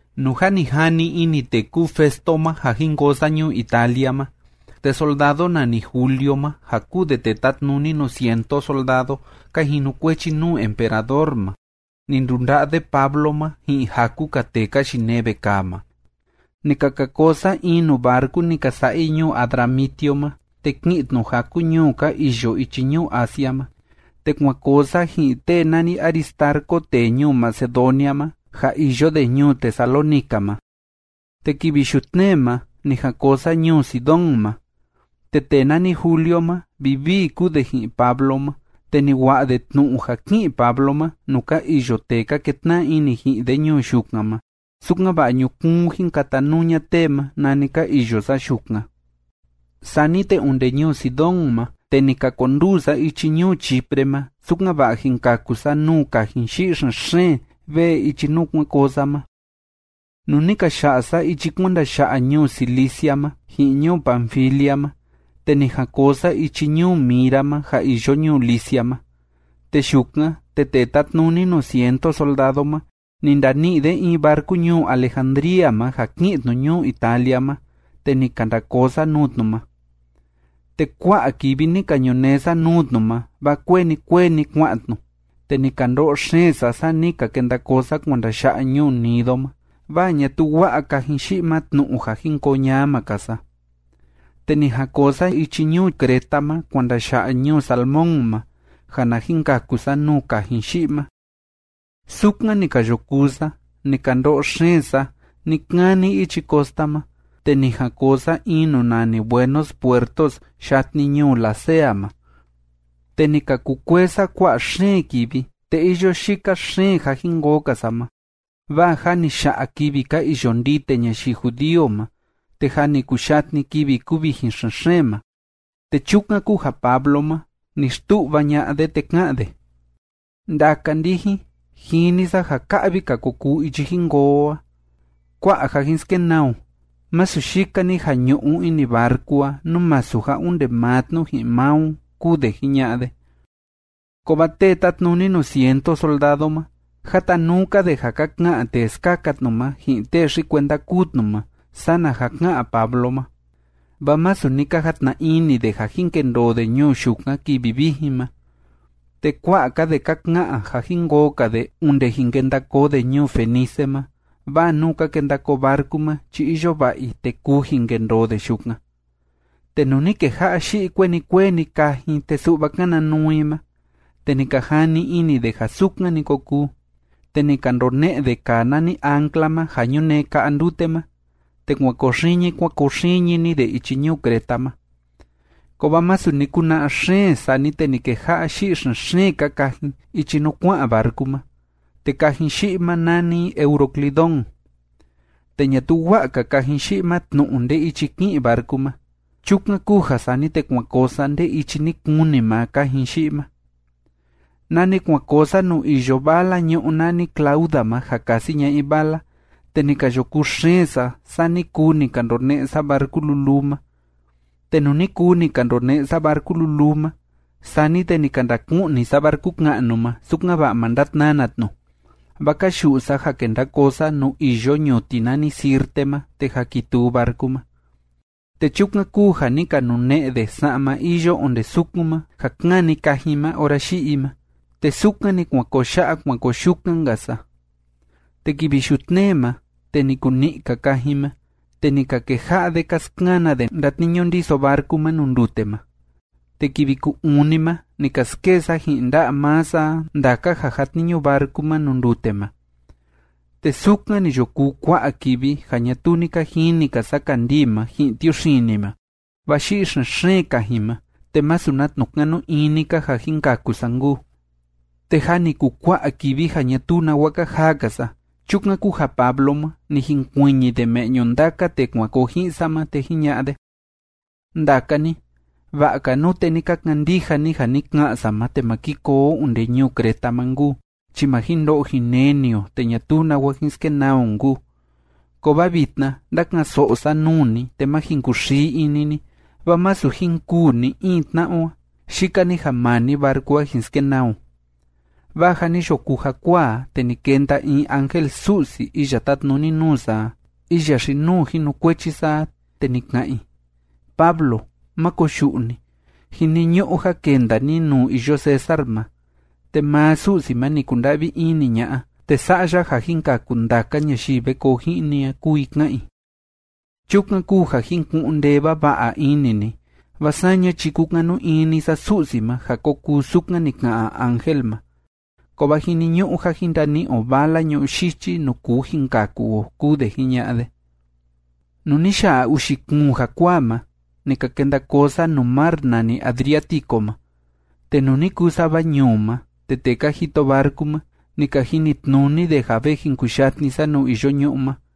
Nuu jâ ni jani ini tee kúu Festo ma ja jin koo sa ñuu Italia ma, te soldado nani Julio ma ja kúu de tee tátnuni nuu cientu soldado ka jinukuechi nuu emperador ma, ni ndunda'a de Pablo ma ji'in jaku‑ka tee ka yinee vekaa ma. Ni ka ka koo sa in nuu barcu ni ka sa'a i ñuu Adramitio ma, te ki'in tnu jaku ñuu ka iyo ichi ñuu Asia ma, te kuan koo sa ji'in tee nani Aristarco tee ñuu Macedonia ma ja iyo de ñuu Tesalónica ma. Te kivi yutnee ma ni jan koo sa ñuu Sidón ma. Te tee nani Julio ma, vivii kúu de ji'in Pablo ma, te ni wa'a de tnu'u ja ki'in Pablo nuu ka iyo tee ka ketna'a ini ji'in de ñuu yukan ma, sukan‑va'a ñukuun jin katanuu ña'a tee ma nani ka iyo sa yukan. Sani te onde ñuu Sidón ma, te ni ka konduu sa ichi ñuu Chipre ma, sukan‑va'a jin kaku sa nuu kajin yi'i xen‑xeen vee ichi nuu kuan koo sa ma. Nuu ni ka ya'a sa ichi kuan ndaya'a ñuu Cilicia ma ji'in ñuu Panfilia ma, te ni jan koo sa ichi ñuu Mira ma ja iyo ñuu Licia ma. Te yukan, te tee tátnuni nuu cientu soldado ma, ni ndani'i de in barcu ñuu Alejandría ma ja ki'in tnu ñuu Italia ma, te ni ka nda koo sa nuu tnu ma, te kua'a kivi ni ka ñunee sa nuu tnu ma, vaa kueni kueni kua'an tnu, te ni ka ndo'o xeen sa, saa ni ka kenda koo sa kuan ndaya'a ñuu Gnido ma, vaa ñatuu wa'a kajin yi'i ma tnu'u ja jin koo ñama‑ka sa. Te ni jan koo sa ichi ñuu Creta ma kuan ndaya'a ñuu Salmón ma, ja na jin kaku sa nuu kajin yi'i ma. Sukan ni ka yo kuu sa ni ka ndo'o xeen sa ni‑kani ichi costa ma, te ni jan koo sa in nuu nani Buenos Puertos, yatni ñuu Lasea ma. Te ni ka kukuee sa kua'a xeen kivi, te iyo yika xeen ja jin koo‑ka sa ma, vaa jâ ni ya'a kivi ka iyo ndite ñayii judío ma, te jâ ni kuyatni kivi kuvijin xen‑xeen ma. Te chukan kúu ja Pablo ma, ni xtu'va ña'a de, te ká'an de: ―Ndaka ndijin, jini sa ja ka'vi‑ka ko kuu ichi jin koo o a. Kua'a ja jin skenaa o, masu yika‑ni ja ñu'u ini barcu a, nú masu ja onde maa tnu ji'in maa o ―kúu de jiña'a de. Kovaa tee tátnuni nuu cientu soldado ma, jatanuu‑ka de ja ka ka'an tee skaka tnu ma ji'in tee xi‑kuenda kúu tnu ma sana ja ká'an Pablo ma. Vaa masu ni ka jatna ini de ja jin kendoo de ñuu yukan kivi vijin ma, te kua'a‑ka de ka ka'an ja jin koo‑ka de onde jin kenda koo de ñuu Fenice ma, vaa nuu ka kenda koo barcu ma chi iyo va'a i te kuu jin kendoo de yukan. Te nuu ni keja'a yi'i kueni kueni kajin, te su'va kana nuu i ma, te ni ka jani ini de ja sukan‑ni ko kuu, te ni ka ndone'e de kaa nani ancla ma ja ñunee ka'a ndute ma, te kuan koo xiñi kuan koo xiñi‑ni de ichi ñuu Creta ma. Kovaa masu ni kuna'a xeen, sani te ni keja'a yi'i xen‑xeen‑ka kajin ichi nuu kua'an barcu ma, te kajin yi'i ma, nani i Euroclidón. Te ñatuu wa'a‑ka kajin yi'i ma tnu'u nde ichi ki'in barcu ma. Chukan kúu ja sani te kuan koo sa nde ichi ni kuni maa kajin yi'i ma. Nani kuan koo sa nuu iyo vala ñu'ú nani Clauda ma, ja kasi ña'a i vala, te ni ka yo kuu xeen sa, saa ni kuu ni ka ndone'e sa barcu luluu ma. Te nuu ni kuu ni ka ndone'e sa barcu luluu ma, sani te ni ka ndaku'ni sa barcu ka'nu ma, sukan‑va'a ma ndatnana tnu, vaa ka yu'u sa ja kenda koo sa nuu iyo ñuti nani Sirte ma te jakituu barcu ma. Te chukan kúu ja ni ka nune'e de sa'ma iyo onde sukun ma ja kani kajin ma ora yi'i i ma, te sukan‑ni kuan koo ya'a kuan koo yukan‑nka sa. Te kivi yutnee ma, te ni kuni'i‑ka kajin ma, te ni ka keja'a de ka skana de ndatniñu ndiso barcu ma nuu ndute ma. Te kivi ku‑uni ma ni ka skee sa ji'in nda'a maa sa a ndaka ja jatniñu barcu ma nuu ndute ma. Te sukan ni yo kuu kua'a kivi ja ñatuu ni ka jini‑ka sa kandii ma ji'in tiuxini ma, vaa yi'i xen‑xeen kajin ma, te masu na tnu'u kanu ini‑ka ja jin kaku sa nkuu. Te jâ ni kukua'a kivi ja ñatuu nawa ka jaa‑ka sa. Chukan kúu ja Pablo ma, ni jinkuiñi de me'ñu ndaka tee kuan koo ji'in sa ma, te jiña'a de: ―Ndaka ni, va'a‑ka nute ni ka kandija ni ja ni ka'an sa ma te ma ki koo o onde ñuu Creta ma nkuu, chi ma jin ndo'o jin neni o te ñatuu nawa jin skenaa o nkuu. Kovaa vitna ndáka'an‑so'o sa nuu ni, te má jin kuxii ini ni, vaa masu jin kûu ni‑in tna'a o a, yika‑ni ja maa‑ni barcu a jin skenaa o. Vaa ja ni yo kuu jakuaa a, te ni kenda in ángel Su'si iya tátnuni nuu sa a, iya xi‑nuu jinukuechi sa a, te ni ka'an i: “Pablo, máko koyu'u ni. Jiniñu'u ja kenda ni nuu iyo César ma. Te maa Su'si ma ni kunda'vi ini ña'a te sa'a ya ja jin kaku ndaka ñayii ve koo ji'in ni a”, kúu i ká'an i. Chukan kúu ja jin ku'un ndee vava'a ini ni, vaa saña chi kúkanu ini sa Su'si ma ja ko kuu sukan ni ka'an ángel ma, kovaa jiniñu'u ja jin ndani'i o vala ñu'ú yichi nuu kuu jin kaku o ―kúu de jiña'a de. Nuu ni ya'a uxi kuun jakuaa ma, ni ka kenda koo sa nuu mar nani Adriático ma, te nuu ni kuu sava ñuu ma, te tee ka jito barcu ma, ni ka jinitnuni de ja ve jin kuyatni sa nuu iyo ñu'ú ma.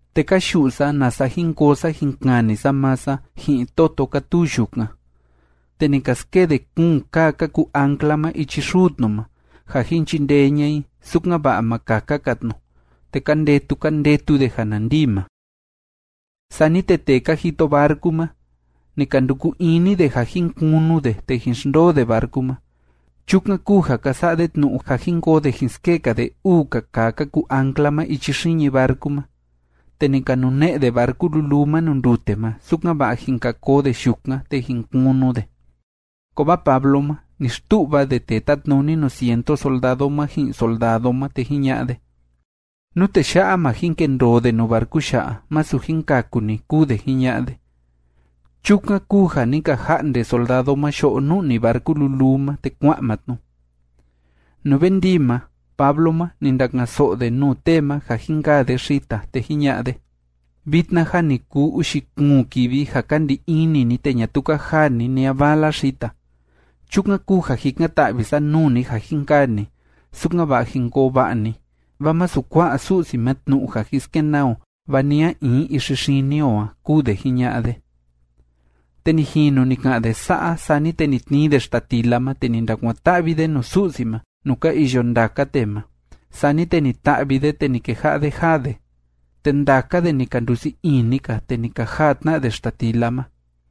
Te ka yu'u sa, nasa jin koo sa jin kani sa maa sa ji'in toto kátuu yukan, te ni ka skee de kuun kaa ka kuu ancla ma ichi xuu tnu ma, ja jin chindee ña'a i sukan‑va'a ma kaka‑ka tnu, te ka ndetu ka ndetu de ja na ndii ma. Sani te tee ka jito barcu ma, ni ka nduku ini de ja jin kunu de te jin xndoo de barcu ma. Chukan kúu ja ka sa'a de tnu'u ja jin koo de jin skee‑ka de uu‑ka kaa ka kuu ancla ma ichi xiñi barcu ma, te ni ka nune'e de barcu luluu ma nuu ndute ma, sukan‑va'a jin ka koo de yukan te jin kunu de. Kovaa Pablo ma, ni xtu'va de tee tátnuni nuu cientu soldado ma, ji'in soldado ma, te jiña'a de: ―Nú tee ya'a, ma jin kendoo de nuu barcu ya'a, masu jin kaku ni ―kúu de jiña'a de. Chukan kúu ja ni ka ja'nde soldado ma yo'o nu'ni barcu luluu ma, te kua'an maa tnu. Nuu ve ndii ma, Pablo ma, ni ndaka'an‑so'o de nuu tee ma ja jin kaa de xita, te jiña'a de: ―Vitna jâ ni kuu uxi kuun kivi ja ka ndi ini ni te ñatuu ka jaa ni ni a vala xita. Chukan kúu ja jikan‑ta'vi sa nuu ni ja jin kaa ni, sukan‑va'a jin koo va'a ni, vaa masu kua'a Su'si ma tnu'u ja jin skenaa o va ni a in ixi xini o a ―kúu de jiña'a de. Te ni jinu ni ka'an de sa'a, sani te ni tnii de xtatila ma, te ni ndakuan‑ta'vi de nuu Su'si ma, nuu ka iyo ndaka tee ma. Sani te ni ta'vi de, te ni keja'a de jaa de. Te ndaka de ni ka ndusii ini‑ka, te ni ka jaa tna de xtatila ma.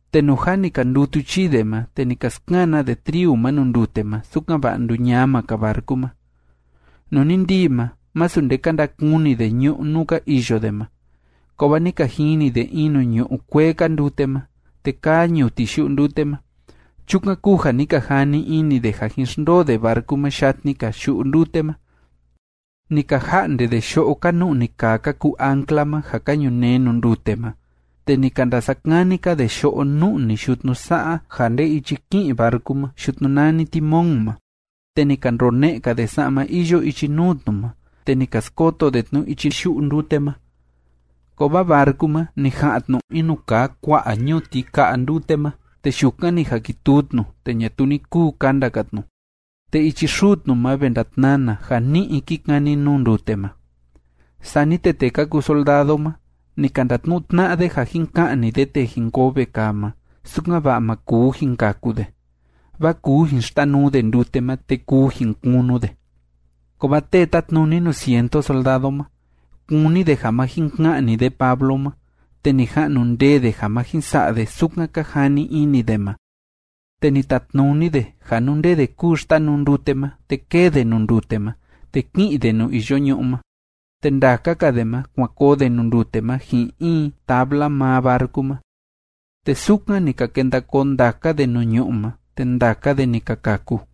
Te nuu jâ ni ka ndutu chii de ma, te ni ka skana de triu ma nuu ndute ma, sukan‑va'a nduñama‑ka barcu ma. Nuu ni ndii ma, masu nde ka ndakuni de ñu'ú nuu ka iyo de ma, kovaa ni ka jini de in nuu ñu'u kuee‑ka ndute ma, te kaa ñuti yu'u ndute ma. Chukan kúu ja ni ka jani ini de ja jin xndoo de barcu ma yatni‑ka yu'u ndute ma. Ni ka ja'nde de yo'o ka nu'ni kaa ka kuu ancla ma ja ka ñunee nuu ndute ma, te ni ka ndasa'a kani‑ka de yo'o nu'ni yutnu sa'a ja nde ichi ki'in barcu ma yutnu nani timón ma, te ni ka ndone'e‑ka de sa'ma iyo ichi nuu tnu ma, te ni ka skoto de tnu ichi yu'u ndute ma. Kovaa barcu ma, ni ja'an tnu in nuu kaa kua'a ñuti ka'a ndute ma, te yukan ni jakituu tnu, te ñatuu ni kuu kanda‑ka tnu, te ichi xuu tnu ma ve ndatnana ja ni'i kí kani nuu ndute ma. Sani te tee ka kuu soldado ma, ni ka ndatnu'u tna'a de ja jin ka'ni de tee jin koo vekaa ma, sukan‑va'a ma kuu jin kaku de, vaa kuu jin xtanuu de ndute ma, te kuu jin kunu de. Kovaa tee tátnuni nuu cientu soldado ma, kúni de ja ma jin ka'ni de Pablo ma, te ni ja'nu ndee de ja ma jin sa'a de sukan ka jani ini de ma. Te ni tatnuni de ja nú nde de kúu xtanuu ndute ma, te kée de nuu ndute ma, te kí'in de nuu iyo ñu'ú ma, te ndaka‑ka de ma, kuan koo de nuu ndute ma ji'in in tabla maa barcu ma. Te sukan ni ka kenda koo ndaka de nuu ñu'ú ma, te ndaka de ni ka kaku.